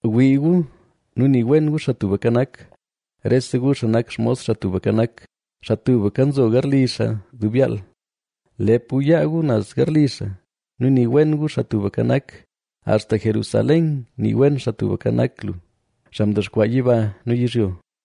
Wii gu nu nii wen gu Xaa Tubka Nak, rese gu xaa nak xmos Xaa Tubka Nak, xaa tubka nzo garli xaa dub yaal. Lep gu yaa gu naz garli xaa nu nii wen gu Xaa Tubka Nak. Axta Jerusalén nii wen Xaa Tubka Nak lu, xaa kwaan mdexkwaa yiba nu yizhyo.